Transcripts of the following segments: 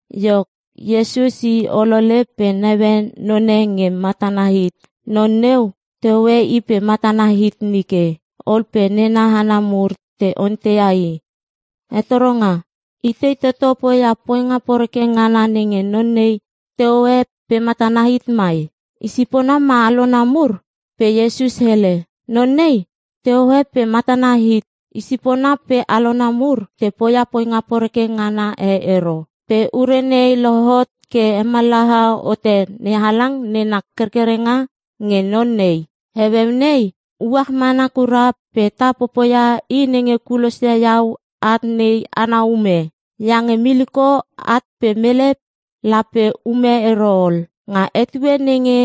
Iok, Iesus i olole pe naue none nge matana hit. Non neu tehoe i pe matana hit nike. Ol pe nena hana mur te onteia i, “Hetoronga, itei toto poia poinga poreke ngana nenge non nei te hoe pe matana hit mai? Isipona ma alona mur?” Pe Iesus hele, “Non nei tehoe pe matana hit. Isipona pe alona mur te poia poinga poreke ngana e ero. Pe ure nei lohot ke hemallaha hote NeHalang nena kerkerenga nge non nei. Heueu nei uach mana kura pe ta popoia i nenge kulosia iau at nei ana ume. Iange miliko at pe mele lape ume ero ol. Nga etue nenge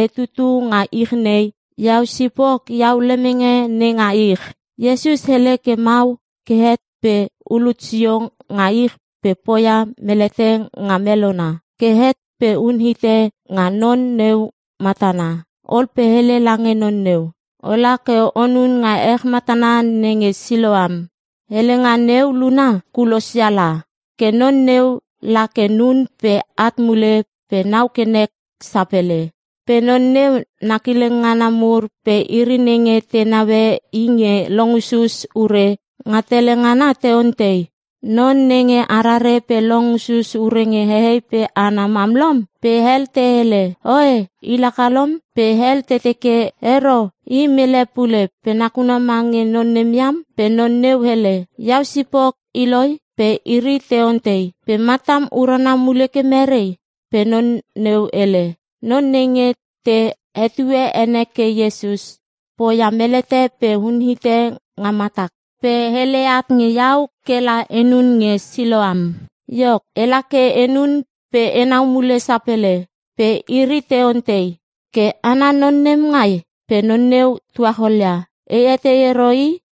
e tutu nga ich nei, iau sipok iau lemenge nenga ich.” Iesus hele ke mau ke het pe ulut sio nga ich pe poia melete nga melona. Ke het pe unhite nga non neu matana. Ol pe hele lange non neu, “Ola ke onun nga ech matana nenge Siloam.” (helenga neu luna, Kulosia la.) Ke non neu la ke nun pe at mule pe nau ke nek sapele. Pe non neu na kileng ngana mur pe iri nenge te naue i nge long usus ure nga tele ngana te ontei, “Non nenge arare pe long usus ure nge hehei pe hana mam lom?” Pe hel te hele, “Oe, i laka lom.” Pe hel teke, “Ero, i mele e pule pe nakuna mange non nem iam.” Pe non neu hele, “Iau sipok i loi.” Pe iri te ontei, “Pe matam urana mule ke merei?” Pe non neu hele, “Non nenge te hetue ene ke Iesus, poia melete pe unhite nga matak. Pe hele at nge iau kela enun nge Siloam. Iok, ela ke enun pe enau mule sapele!” Pe iri te ontei, “Ke ana non nem ngai?” Pe non neu tuacholia, “E etei ero i.”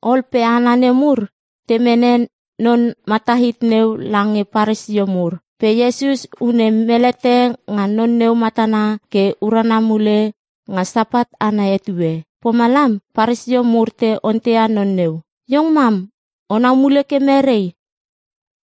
Ol pe hana nemur te mene non mata hit neu lange Paresio mur. Pe Iesus une melete nga non neu matana ke urana mule nga Sapat ana etue. Pomalam Paresio mur te onteia non neu, “Iong mam onau mule ke merei?”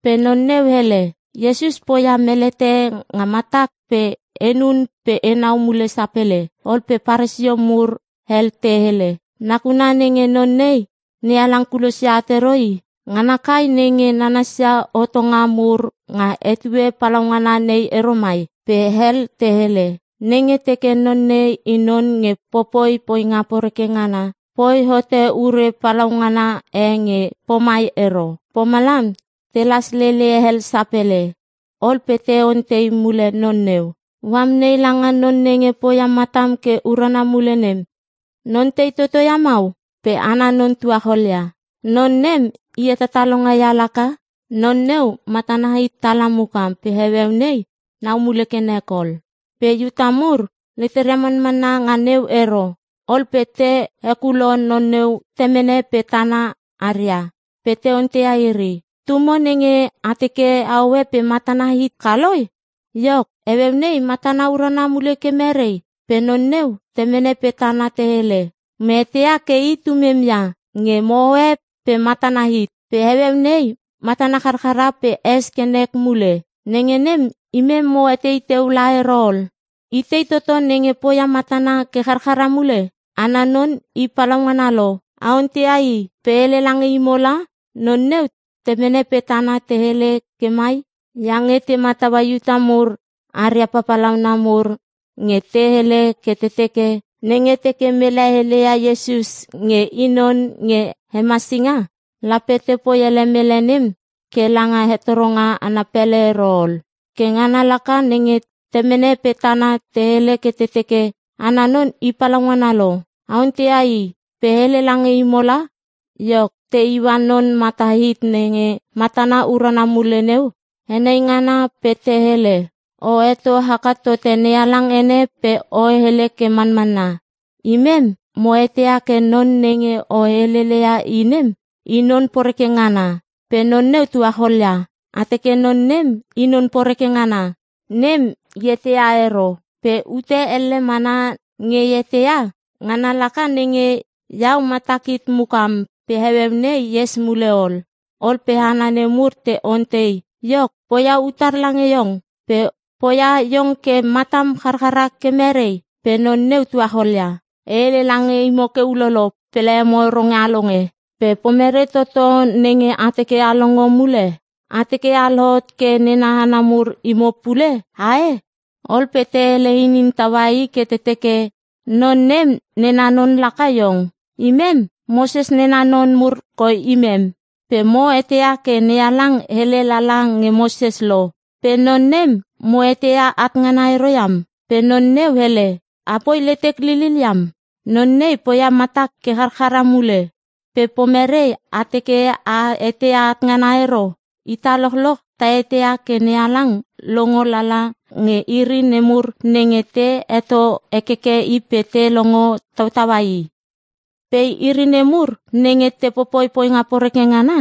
Pe non neu hele, “Iesus poia melete nga matak pe enun pe enau mule sapele.” Ol pe Paresio mur hel te hele, “Nakuna nenge non nei NeHalang kulosia at ero i, ngana kai nenge nanasia hotonga mur nga etue palaungana nei ero mai.” Pe hel te hele, “Nenge teke non nei i non nge popoi poinga poreke ngana, poi hote ure palaungana e nge pomai ero.” Pomalam telas lele hel sapele. Ol pe te ontei mule non neu, “O amnei lange non nenge poia matam ke urana mule nem, non tei toto ia mau?” Pe ana non tuacholia, “Non nem i hetatalonga ia laka.” Non neu matana hit tala mukam pe heueu nei nau mule ke nek ol. Pe Iuta mur leteria manmanna nga neu ero. Ol pe te hekulo non neu temene pe tana aria pe te onteia iri, “Tumo nenge a teke ahoe pe matana hit ka loi? Iok, heueu nei matana urana mule ke merei?” Pe non neu temene pe tana te hele, “Mo eteia ke i tumem ia nge mo hoe pe matana hit. Pe heueu nei matana charchara pe es ke nek mule. Nenge nem imem mo etei teu la ero ol. Itei toto nenge poia matana ke charchara mule? Ana non i palaungana lo. A onteia i pe hele lange imo la.” Non neu temene pe tana te hele ke mai iange te mataua Iuta mur aria papalauna mur nge te hele ke te teke, nenge teke mele heleia Iesus nge i Non nge Hemasinga, lape tepoi ele mele nem ke langa hetoronga ana pele ero ol. Ke ngana laka nenge temene pe tana te hele ke te teke, “Ana non i palaungana lo. A onteia i pe hele lange imo la.” Iok, te iua non mata hit nenge matana urana mule neu henai ngana, pe te hele, “O heto haka tote NeHalang ene pe o hele ke manmanna. Imem mo eteia ke non nenge o helele ia nem i non poreke ngana.” Pe non neu tuacholia, “A teke non nem i non poreke ngana, nem e eteia ero. Pe ute elle mana nge e eteia. Ngana laka nenge; iau matak hit mukam pe heueu nei e es mule ol.” Ol pe hana nemur te ontei, “Iok, poia utar lange iong? Pe poia iong ke matam charchara ke merei?” Pe non neu tuacholia, “E hele lange imo ke ulolo pe lememo ero nge a longe. Pe pomerei toto nenge a teke a longo mule? A teke a lohot ke nena hana mur imo pule? Ae?” Ol pe te hele inin taua i ke te teke, “Non nem nena non laka iong. Imem, Moses nena non mur koi imem. Pe mo eteia ke NeHalang hele lala nge Moses lo, pe non nem mo eteia at ngana ero iam.” Pe non neu hele, “Apoi letek lilil iam. Non nei poia matak ke charchara mule. Pe pomere a teke a eteia at ngana ero? Ita lochloch ta eteia ke NeHalang longo lala nge iri nemur nenge te heto hekeke i pe te longo tautaua i. Pe iri nemur nenge te popoi poinga poreke ngana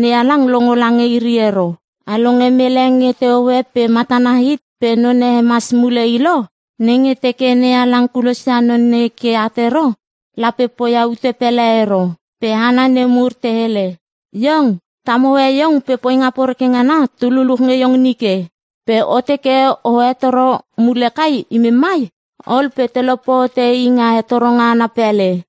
NeHalang longo lange iri ero. A longe mele nge tehoe pe matana hit pe none hemas mule i lo? Nenge teke NeHalang kulosia non nei ke at ero, lape poia ute pele ero.” Pe hana nemur te hele, “Iong tam hoe iong pe poinga poreke ngana tu luluch nge iong nike. Pe o teke o hetoro mule kai imem mai?” Ol pe telope hote i nga hetoronga ana pele.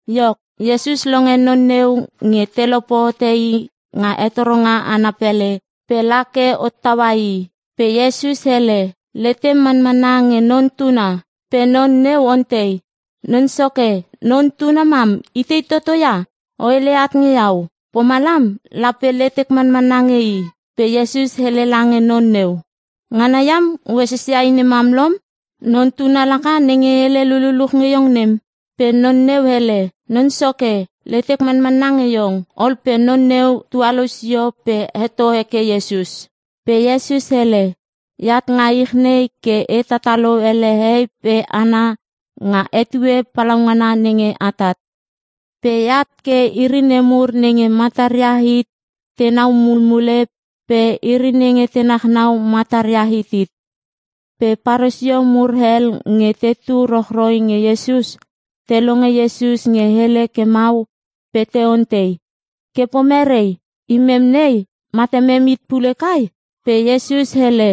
Iok, Iesus longe non neu nge te lope hote i nga hetoronga ana pele pe la ke hottaua i. Pe Iesus hele, “Letem manmanna nge Non Tuna?” Pe non neu ontei, “Non Soke, Non Tuna mam itei toto ia? O heleia at nge iau. Pomalam lape letek manmanna nge i.” Pe Iesus hele lange non neu, “Ngana iam o esesia i nemam lom. Non Tuna laka nenge hele lululuch nge iong nem.” Pe non neu hele, “Non Soke, letek manmanna nge iong.” Ol pe non neu tualou sio pe heto heke Iesus. Pe Iesus hele, “Eat nga ich nei ke e tatalo ele hehei pe hana nga etue palaungana nenge atat. Pe eat ke iri nemur nenge mataria hit tenau mulmule pe iri nenge te nachnau mataria hitit.” Pe Paresio mur hel nge tetu rochroi nge Iesus, te longe Iesus nge hele ke mau pe te ontei, “Ke pomerei? Imem nei matamem hit pule kai?” Pe Iesus hele,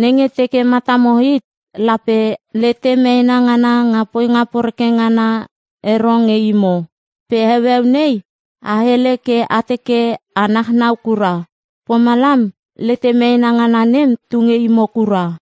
“Nenge teke matamo hit lape lete meena ngana nga poinga poreke ngana ero nge imo. Pe heueu nei a hele ke a teke a nachnau kura. Pomalam lete meena ngana nem tu nge imo kura.”